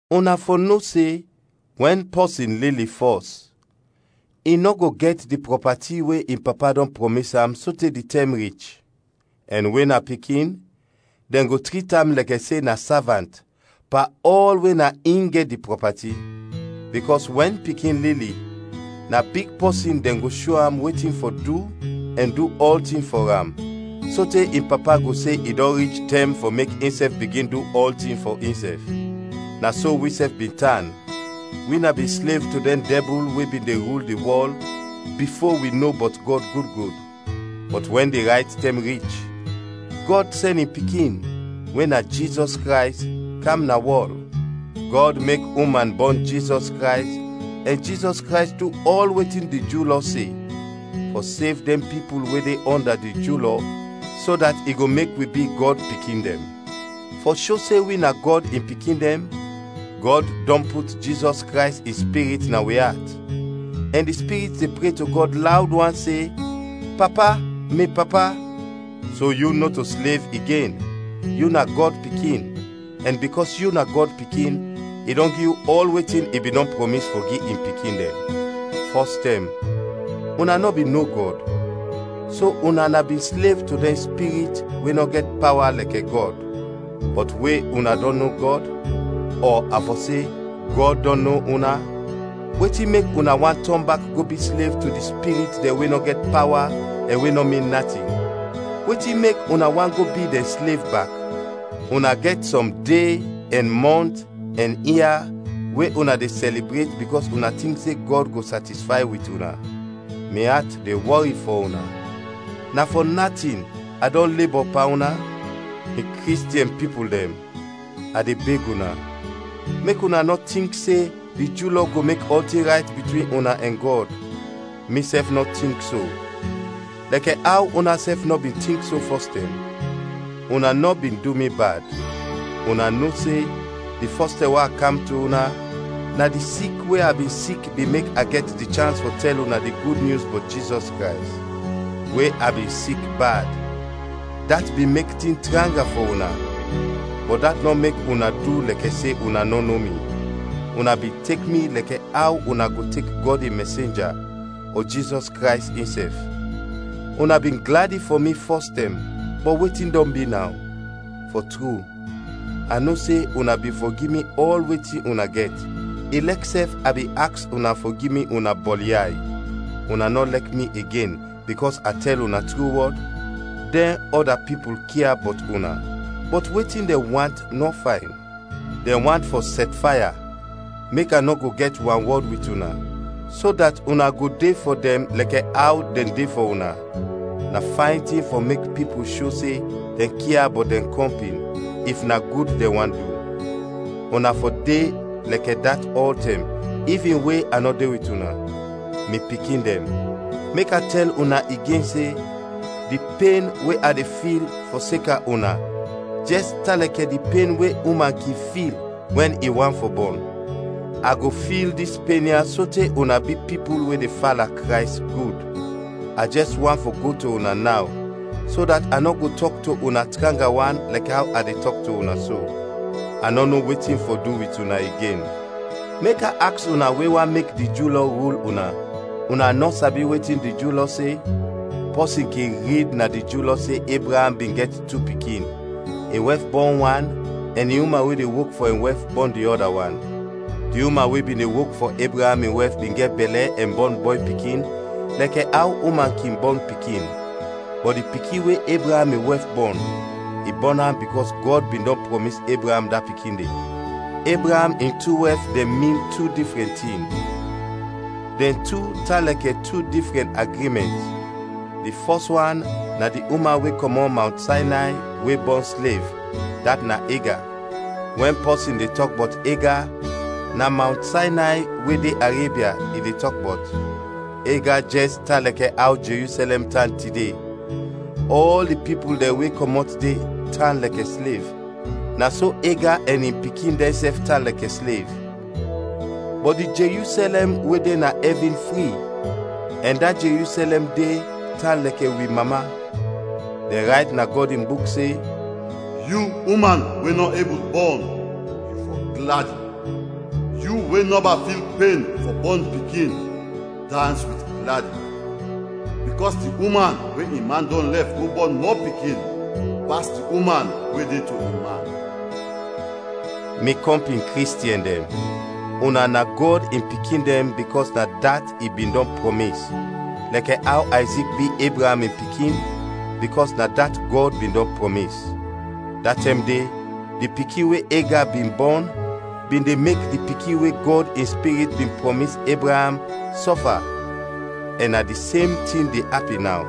Una fɔ no se, wɛn pɔsin lili fɔs, i nɔ go gɛt di prɔpati we in papa dɔn prɔmis am sote di tɛm rich. Ɛn we na pikin, dɛn go trit am lɛkɛ se na savant, pan ɔl we na in gɛt di prɔpati. Bikɔs wɛn pikin lili, na big pɔsin dɛn go sho am wetin fɔ du ɛn du ɔltin fɔ am sote in papa go se i dɔn rich tɛm fɔ mek insɛf bigin du ɔltin fɔ insɛf. Na so wisɛf bin tan, wi na bin slev to dɛn dɛbul we bin de rul di wɔl, bifo wi no bɔt Gɔd gud gud. Bɔt wɛn di rayt tɛm rich, Gɔd sɛn in Pikin, we na Jizɔs Krays, kam na wɔl. Gɔd mek uman bɔn Jizɔs Krays ɛn Jizɔs Krays du ɔl wetin di Ju lɔ se, fɔ sev dɛn pipul we de ɔnda di Ju Lɔ, so dat i go mek wi bi Gɔd pikin dɛn. Fɔ sho se wi na Gɔd in pikin dɛn, Gɔd dɔn put Jizɔs Krays in Spirit na wi at, ɛn di Spirit de pre to Gɔd lawd wan se, “Papa, mi Papa!” So yu nɔto slev igen, yu na Gɔd pikin, ɛn bikɔs yu na Gɔd pikin, i dɔn gi yu ɔl wetin i bin dɔn prɔmis fɔ gi in pikin dɛn. Fɔs tɛm, una nɔ bin no Gɔd, so una na bin slev to dɛn spirit we nɔ gɛt pawa lɛkɛ Gɔd. Bɔt we una dɔn no Gɔd, ɔ a fɔ se, Gɔd dɔn no una; wetin mek una want tɔn bak go bi slev to di spirit dɛn we nɔ gɛt pawa ɛn we nɔ min natin? Wetin mek una want go bi dɛn slev bak? Una gɛt sɔm de, ɛn mɔnt, ɛn ia we una de sɛlibret bikɔs una tink se Gɔd go satisfay wit una. Mi at de wɔri fɔ una, na fɔ natin a dɔn lebɔ pan una? Mi Kristiɛn pipul dɛn, a de beg una, mek una nɔ tink se di Ju Lɔ go mek ɔltin rayt bitwin una ɛn Gɔd. Misɛf nɔ tink so, lɛkɛ aw unasɛf nɔ bin tink so fɔstɛm. Una nɔ bin du mi bad. Una no se, di fɔs tɛm we a kam to una, na di sik we a bin sik bin mek a gɛt di chans fɔ tɛl una di Gud Nyus bɔt Jizɔs Krays. We a bin sik bad, dat bin mek tin tranga fɔ una, bɔt dat nɔ mek una du lɛkɛ se una nɔ no mi. Una bin tek mi lɛkɛ aw una go tek Gɔd in mɛsenja, ɔ Jizɔs Krays insɛf. Una bin gladi fɔ mi fɔs tɛm, bɔt wetin dɔn bi naw? Fɔ tru a no se una bin fɔ gi mi ɔl wetin una gɛt, ilɛk sɛf a bin aks una fɔ gi mi una bɔlyay. Una nɔ lɛk mi igen bikɔs a tɛl una tru wɔd? Dɛn ɔda pipul kia bɔt una, bɔt wetin dɛn want nɔ fayn. Dɛn want fɔ sɛtfaya, mek a nɔ go gɛt wanwɔd wit una, so dat una go de fɔ dɛn lɛkɛ aw dɛn de fɔ una. Na fayn tin fɔ mek pipul sho se dɛn kia bɔt dɛn kɔmpin, if na gud dɛn want du. Una fɔ de lɛkɛ dat ɔltɛm, ivin we a nɔ de wit una. Mi pikin dɛn, mek a tɛl una igen se, di pen we a de fil fɔseka una jɛs tan lɛkɛ di pen we uman kin fil wɛn i want fɔ bɔn. A go fil dis pen ya sote una bi pipul we de fala Krays gud. A jɛs want fɔ go to una naw, so dat a nɔ go tɔk to una tranga wan lɛkɛ aw a de tɔk to una so. A nɔ no wetin fɔ du wit una igen. Mek a aks una we want mek di Ju Lɔ rul una, una nɔ sabi wetin di Ju Lɔ se? Pɔsin kin rid na di Ju Lɔ se Ebraam bin gɛt tu pikin, in wɛf bɔn wan, ɛn di uman we de wok fɔ in wɛf, bɔn di ɔda wan. Di uman we bin de wok fɔ Ebraam in wɛf bin gɛt bɛlɛ ɛn bɔn bɔy pikin lɛkɛ aw uman kin bɔn pikin, bɔt di pikin we Ebraam in wɛf bɔn, i bɔn am bikɔs Gɔd bin dɔn prɔmis Ebraam da pikin de. Ebraam in tu wɛf dɛn min tu difrɛn tin: dɛn tu tan lɛkɛ tu difrɛn agrimɛnt. Di fɔs wan na di uman we kɔmɔt Mawnt Saynay we bɔn slev, dat na Ega. Wɛn pɔsin de tɔk bɔt Ega, na Mawnt Saynay we de Arebia, i de tɔk bɔt. Ega jɛs tan lɛkɛ aw Jerusɛlɛm tan tide, ɔl di pipul dɛn we kɔmɔt de tan lɛkɛ slev, na so Ega ɛn in pikin dɛnsɛf tan lɛkɛ slev. Bɔt di Jerusɛlɛm we de na ɛvin fri, ɛn da Jerusɛlɛm de tan lɛkɛ wi mama. Dɛn rayt na Gɔd in Buk se, “Yu uman, we nɔ ebul bɔn, yu fɔ gladi! Yu we nɔba fil pen fɔ bɔn pikin, dans wit gladi! Bikɔs di uman we in man dɔn lɛf go bɔn mɔ pikin, pas di uman we de to in man.” Mi kɔmpin Kristiɛn dɛn, una na Gɔd in pikin dɛn bikɔs na dat i bin dɔn prɔmis, lɛkɛ aw Ayzik bi Ebraam in pikin, bikɔs na dat Gɔd bin dɔn prɔmis. Da tɛm de di pikin we Ega bin bɔn bin de mek di pikin we Gɔd in Spirit bin prɔmis Ebraam, sɔfa, ɛn na di sem tin de apin naw.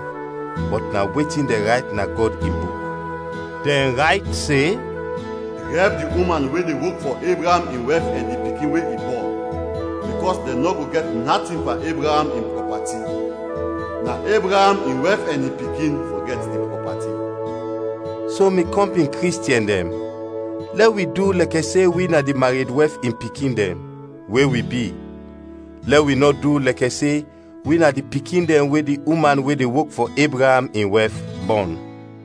Bɔt na wetin dɛn rayt na Gɔd in Buk? Dɛn rayt se, “Drɛb di uman we de wok fɔ Ebraam in wɛf ɛn di pikin we i bɔn, bikɔs dɛn nɔ go gɛt natin pan Ebraam in prɔpati; na Ebraam in wɛf ɛn in pikin fɔ gɛt di prɔpati.” So, mi kɔmpin Kristiɛn dɛn, lɛ wi du lɛkɛ se wi na di mared wɛf in pikin dɛn, we wi bi, lɛ wi nɔ du lɛkɛ se wi na di pikin dɛn we di uman we de wok fɔ Ebraam in wɛf bɔn.